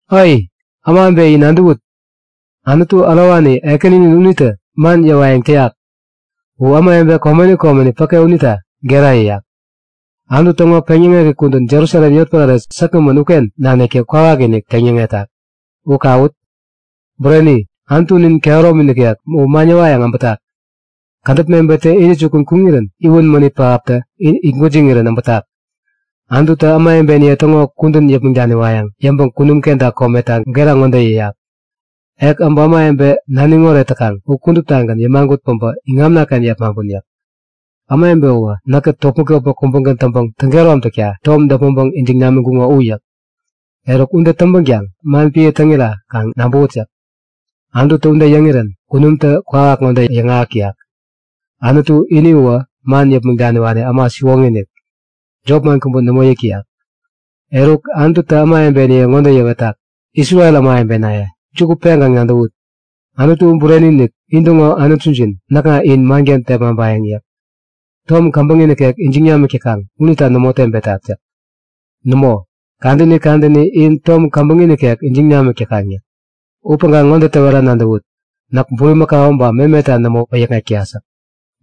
Ai! Ämawebe in nadäwut! Anutu ärowani, Ekäninin unitä man yäwayäŋ täyak. U ämawebe komeni komeni päke unita gera yäyak. Anutu täŋo peŋyäŋek kudän Jerusalem yotpärare säkgämän uken naniktä kwawakinik teŋ yäŋetak. U kawut! Bureni! Anutunin kehäromi nikek u man yäwayäŋ äbätak. Kädäp mebettä intäjukun kuŋirän iwän mänit pähaptä itgwäjiŋirän äbätak. Anututä ämawebeniye täŋo kudän yäpmäŋ daniwayäŋ yäŋpäŋ kunum kenta kometa gera ŋode yäyak; Ek äbä ämawebe naniŋ oret täkaŋ u kuduptagän yämagut päbä iŋamnaken yepmaŋpun yäk. Ämawebe uwä näkkät topmäk-topmäk kubägän täŋpäŋ täŋ-kehäromtakta tom däpmäŋpäŋ ijiŋ namiŋkuŋo u yäk. Eruk, ude täŋpänkaŋ man piä täŋira kaŋ nabäwut yäk. Anututä ude yäŋirän kunumtä kwawak ŋode yäŋahäk täyak; Anutu ini uwä man yäpmäŋ daniwani äma siwoŋi-inik. Jop man kubä nämo yäk täyak. Eruk, Anututä ämawebeniye ŋode yäwetak; Isrel ämawebenaye, juku peŋkaŋ nadäwut! Anutu bureni-inik, intäŋo Anutujin näkŋa in manken tepmaŋpayäŋ yäk. Tom käbäŋi nikek ijiŋ namik täkaŋ unita nämo tebetat yäk. Nämo, kadäni kadäni in tom käbäŋi nikek ijiŋ namik täkaŋ yäk. Upäŋkaŋ ŋode täwera nadäwut; Näk bulimakau ba memeta nämo wäyäkŋek täyat yäk.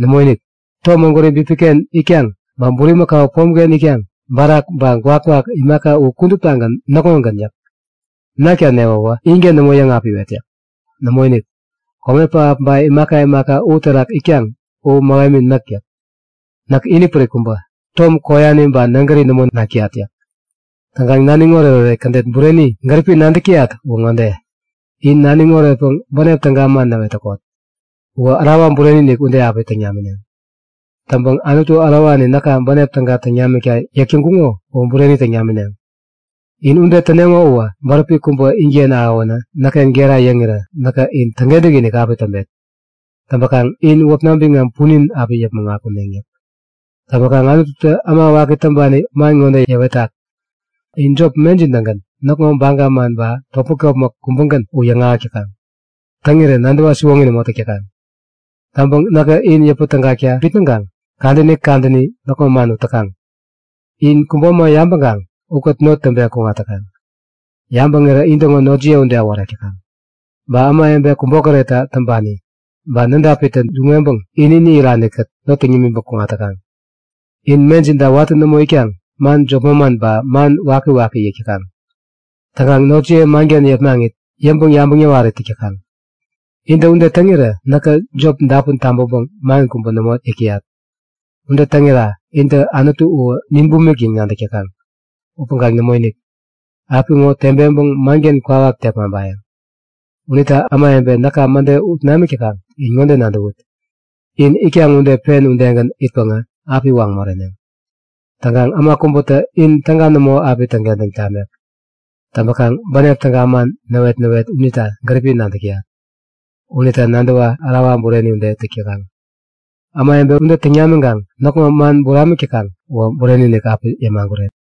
Nämoinik, tom ägwäri bipiken itkaŋ, ba bulimakau pomken itkaŋ, barak ba gwakgwak imaka u kuduptagän näkŋogän yäk. Nakta newäwä inken nämo yäŋapiwet yäk. Nämoinik, kome pähap ba imaka imaka u terak itkaŋ u mähemi näk yäk. Näk inipärik kubä. Tom koyani ba nägäri nämo nak täyat yäk. Täŋpäkaŋ naniŋ oretoret kädet bureni gäripi näkä nadäk täyat uwä ŋode; In naniŋ oretpäŋ bänep täga man yäk täkot. Uwä ärawa bureni ude api täŋ namineŋ. Täŋpäŋ Anutu ärowani näka bänep täga täŋ namikta yäk täŋkuŋo uwä bureni täŋ namineŋ! In ude täneŋo uwä bäräpi kubä inken ahäwänä näkken gera yäŋirä näkä in täŋkentäk-inik api täŋpet. Täŋpakaŋ in wäpna biŋam punin api yäpmäŋ akuneŋ yäk. Täŋpäkaŋ Anututä äma waki täŋpani man ŋode yäwetak; In jop, mejin-tägän näkŋo baga man ba topmäk-topmäk kubägän u yäŋahäk täkaŋ. Täŋirä nadäwa siwoŋi nämo täk täkaŋ. Täŋpäŋ näkä in yäpä tägakta bitnäŋkaŋ kadäni kadäni näkŋo man ut täkaŋ. In kubo äma yabäŋkaŋ ukät not täŋpeŋ kuŋat täkaŋ. Yabäŋirä intäŋo notjiye ude äworek täkaŋ. Ba ämawebe kubokäretta täŋpani ba nädapitä duŋ-weŋpäŋ ini-ini iranikät not täŋ yämiŋpäŋ kuŋat täkaŋ. In mejinta watä nämo itkaŋ man jop manman ba man wakiwaki yäk täkaŋ. Täŋkaŋ notjiye manken yepmaŋit yäŋpäŋ-yabäŋ yäwarit täk täkaŋ. Intä ude täŋirä näkä jop dapun tabäŋpäŋ man kubä nämo yäk täyat. Ude täŋira intä Anutu u nin bumik yäŋ nadäk täkaŋ. Upäŋkaŋ nämoinik! Apiŋo tebeŋpäŋ manken kwawak tepmaŋpayäŋ. Unita ämawebe näka mäde ut namik täkaŋ, in ŋode nadäwut; In itkaŋ ude pen udegän itpäŋä api waŋ moreneŋ. Täŋkaŋ äma kubätä in täga nämo api täŋkentäŋ tamek. Täŋpäkaŋ bänep täga man näwet-näwet unita gäripi nadäk täyat. Unita nadäwa ärawa bureni ude täk täkaŋ. Ämawebe ude täŋ namiŋkaŋ näkŋo man buramik täkaŋ uwä bureni-inik api yämaguret.